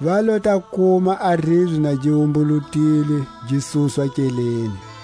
Va lo ta kuma a ribye na gi wumbulutilwe gi suswa nkeleni.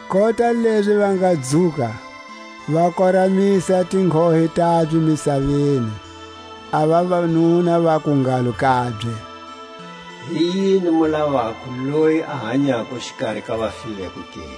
Kota lezi va nga dzuka, va koramisa tinghohe tabye misaveni, a vavanuna vaku ngalo kabye: Hi yini mu lavako loyi a hanyako xikari ka vafileko ke?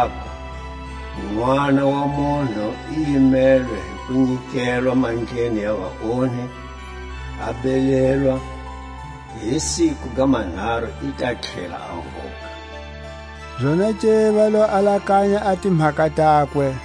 aku: Nʼwana wa munhu i yimelwe hi ku nyikelwa mandleni ya vaonhi, a belelwa, hi siku ga manharu i ta tlhela a vuka. Zonake va lo alakanya a timhaka takwe,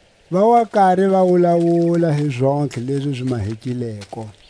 Va wa kari va wulawula hi zontlhe lezi zi mahekileko.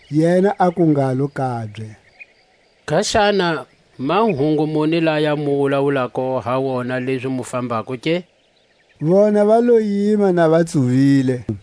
Yena aku ngalo kabye: Kaxana, mahungu muni laya mu wulawulako ha wona lezi mu fambako ke? Vona va lo yima na va tsuvile.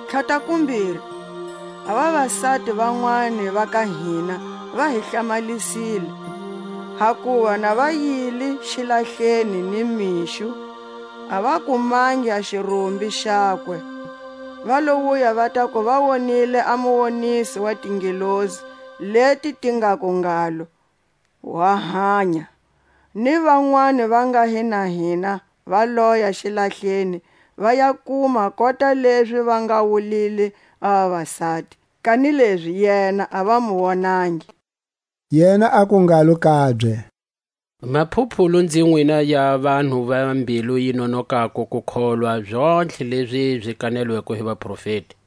Tlhatakumbiri, a vavasati vanwani va ka hina va hi hlamalisile; hakuva na va yile xilahleni ni mixo, a va kumangi a xirumbi xakwe; va lo wuya va taku va wonile a muwoniso wa tingelosi, leti ti ngaku ngalo wa hanya. Ni vanwani va nga hi na hina va loya xilahleni, va ya kuma kota lezi va nga wulile a vavasati; kanilezi yena a va mu wonangi. Yena aku ngalo kabye: Maphuphulu nzi nwina ya vanhu va mbilu yi nonokako ku kholwa zontlhe lezi zi kanelweko hi vaprofeti!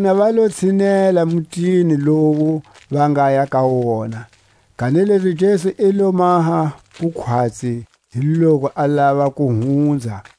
Vona va lo tshinela mutini lowu va ngaya ka wona; kanilezi Jesu i lo maha ku khwatsi hi loku a lava ku hunza.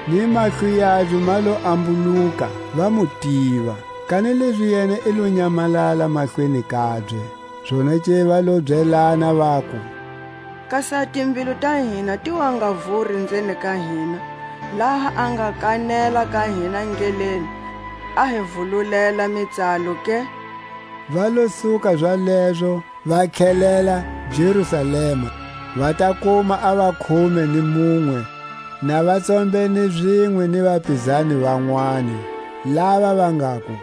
Ni mahlo yabye ma lo ambuluka, va mu tiva; kanilezi yena i lo nyamalala mahlweni kabye. Zonake va lo byelana vaku: Kasi a timbilu ta hina ti wa nga vuri nzeni ka hina, laha a nga kanela ka hina ndleleni, a hi vululela mitsalo ke? Va lo suka zalezo, va tlhelela Jerusalema, va ta kuma a vakhume ni munwe na va tsombene zinwe ni vapizani vanwani, lava va ngaku: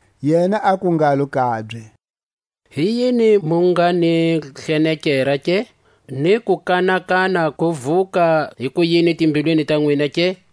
Yena aku ngalo kabye: Hi yini mu nga ni hlenekera ke, ni kukanakana ku vuka hikuyini timbilwini ta nwina ke?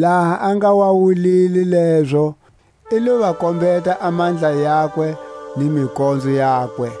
Laha a nga wa wulile lezo, i lo va kombeta a mandla yakwe ni mikonzo yakwe.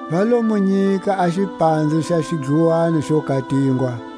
Va lo mu nyika a xipanze xa xidluwani xo katingwa.